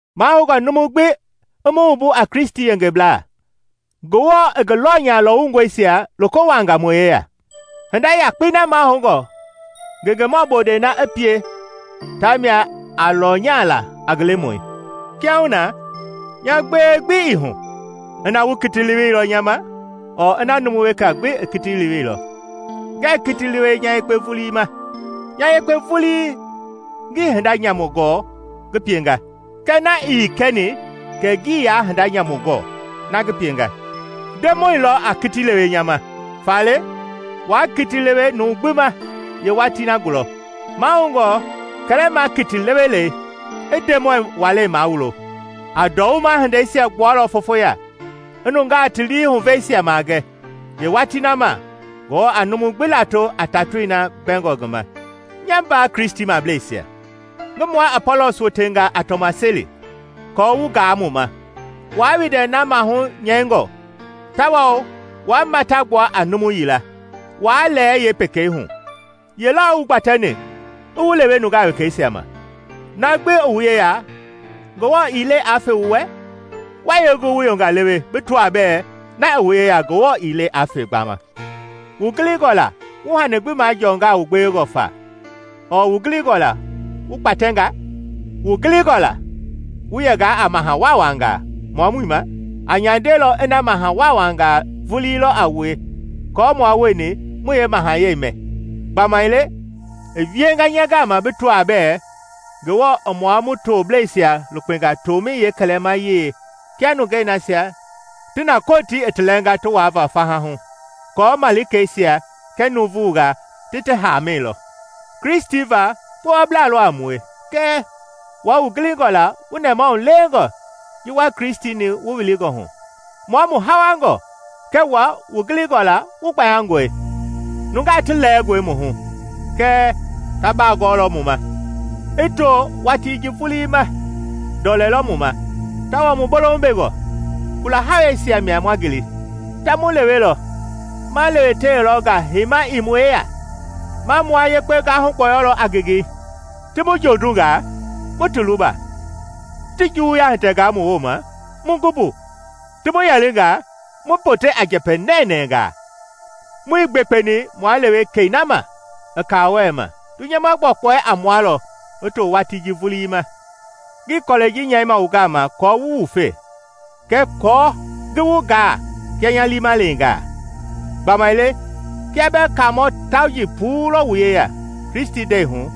Mahoungɔ numu gbi i mu wumbu a Kristi yengeblaa, Ngewɔ i ngi lɔnya lɔwungɔisia loko wuaanga mu yeya. Hinda yakpei na mahoungɔ ngengemɔ bondɛi na i pie tamia a lɔnyala a ngi lemɔi. Kiahuna, nya gbewe gbi ii na ina wu kiti leweilɔ nya ma ɔɔ ina numu weka gbi i teweilɔ; ngɛɛ kiti lewe nya yekpe vulii ma. Nya yekpe vulii ngii hinda nyamu gɔɔ ngi pienga, kɛɛ na ii kɛni kɛ ngii yaa hinda nyamu gɔɔ ngi pienga. Ndemɔi lɔ a kiti lewe nya ma. Faale waa kiti lewe numu gbi ma yeewatii na gulɔ. Mahoungɔ kɛlɛma kiti lewelɛi i Ndemɔi walei mawulo; a ndɔwuma hindeisia gbualɔ fofo ya; i nungaa ti lii huveisia magɛ. Yeewatii na mia Ngewɔ a numu gbi lato a tatoi na mbɛngɔ ngi ma. Nya mbaa Kristimableisia, ngi mua Apɔlɔs wotenga a tɔmaseli aako wu gaa mu ma, waa windɛ na maahu nyɛingɔ tawao waa mata gbua a numu yila, waa lɛɛ yeepekei hu. Ye lɔ i wu gbatɛni i wu lewe nungaa wekeisia ma? Na gbi i wu yeya Ngewɔ ii le aa fe wu wɛ? Wa yee gu wu yonga lewe bi tɔaa bɛɛ na i wu yeya Ngewɔ ii le aa fe gbaama? Wu gilingɔ la wu hani gbi majɔnga wu gbewengɔ fa ɔɔ; wu gilingɔ la wu gbatɛnga? Wu gilingɔ la wu yɛnga a maha waawangaa mua muii ma. A nyandelɔ ina maha waawangaa vulii lɔ a wue aako mua wueni mu yeemahayɛi mɛ. Gbamaile i wienga nya gama bi tɔaa bɛɛ Ngewɔ i mua mu toblɛisia lukpenga tomɛi yeekɛlɛmayei kia nungei nasia ti na Kotii i ti lɛɛnga ti waava faha hu aako malikeisia kɛɛ nuuvungaa ti ti haamɛi lɔ. Kristi va kpowablaa lɔ a mue; kɛɛ wua wu gilingɔ la wu nɛmahulewengɔ ji wua Kristi-ni wu wilingɔ hu! Mua mu hawangɔ kɛɛ wua wu gilingɔ la wu gbayangɔe; nungaa ti lɛɛngɔe mu hu kɛɛ ta bagɔɔlɔ wu ma! I to watii ji vulii ma ndɔlɛ lɔ mu ma, tawao mu bolohu bengɔ; kula hawɛisia mia ma ngili; ta mu lewelɔ; ma lewetewelɔ nga heima ii mu yeya; ma mua yekpe gahu gbɔyɔlɔ a ngengei. Ti mu jondungaa, mu ti luba; ti juwuya hitɛngaa mu wooma, mu gu mbu; ti mu yɛlinga, mu pote a njɛpɛ nɛnɛɛngaa. Muii gbekpeni mua lewe kɛi na ma i kaawɔɛi ma; dunyama yeekpɔkpɔɛi a mua lɔ i to watii ji vulii ma. Ngii kɔlɛi ji nyɛima wu gama aako wu wufe kɛɛ aako ngi wu gaa kia nya liima leenga. Gbamaile kia bɛɛ kaamɔ tauji puu lɔ wu yeya Kristi hindei hu,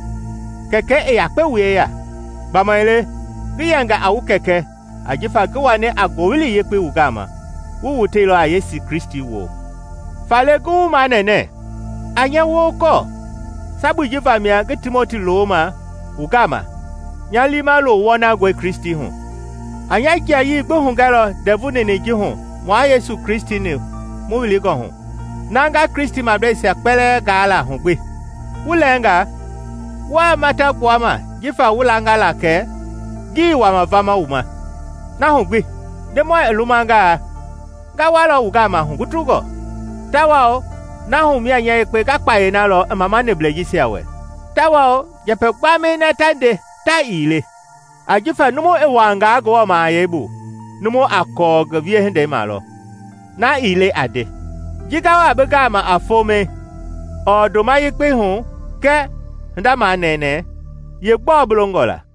Kɛkɛi i yakpe wu yeya. Gbamaile ngi yɛnga a wu kɛkɛ ajifa ji ngi wani a Ngowili Yekpei wu gama wu woteilɔ a Yesu Kristi woo. Faale, ngi wu manɛnɛ, a nya wokɔɔ. Sabui ji vamia ngi Timoti looma wu gama nya liima loo wɔnangɔi Kristi hu. A nya jiayii gbi hugɛlɔ ndɛvu ninɛi ji hu mua Yesu Kristi-ni mu wilingɔ hu, na nga Kristimableisia kpɛlɛɛ gaa la hu gbi. Wu lɛɛnga wua mata gbuama jifa wu langa la kɛ ngii wama vama wu ma. Na hu gbi, Ndemɔi i lumangaa nga walɔ wu gama hugutungɔ, tawao na hu mia nya yekpe nga kpayei na lɔ i mamaniblɛi jisia wɛ, tawao njɛpɛ gbamɛi na ta nde ta ii le. Ajifa numu i wuaanga Ngewɔ mahayɛi bu, numu a kɔɔ ngi wiehindei ma lɔ na ii le a nde. Ji nga wa bi gama a fomɛi, ɔɔ ndoma yekpeihu kɛɛ hinda manɛɛnɛ, yee gbɔɔ bi longɔla?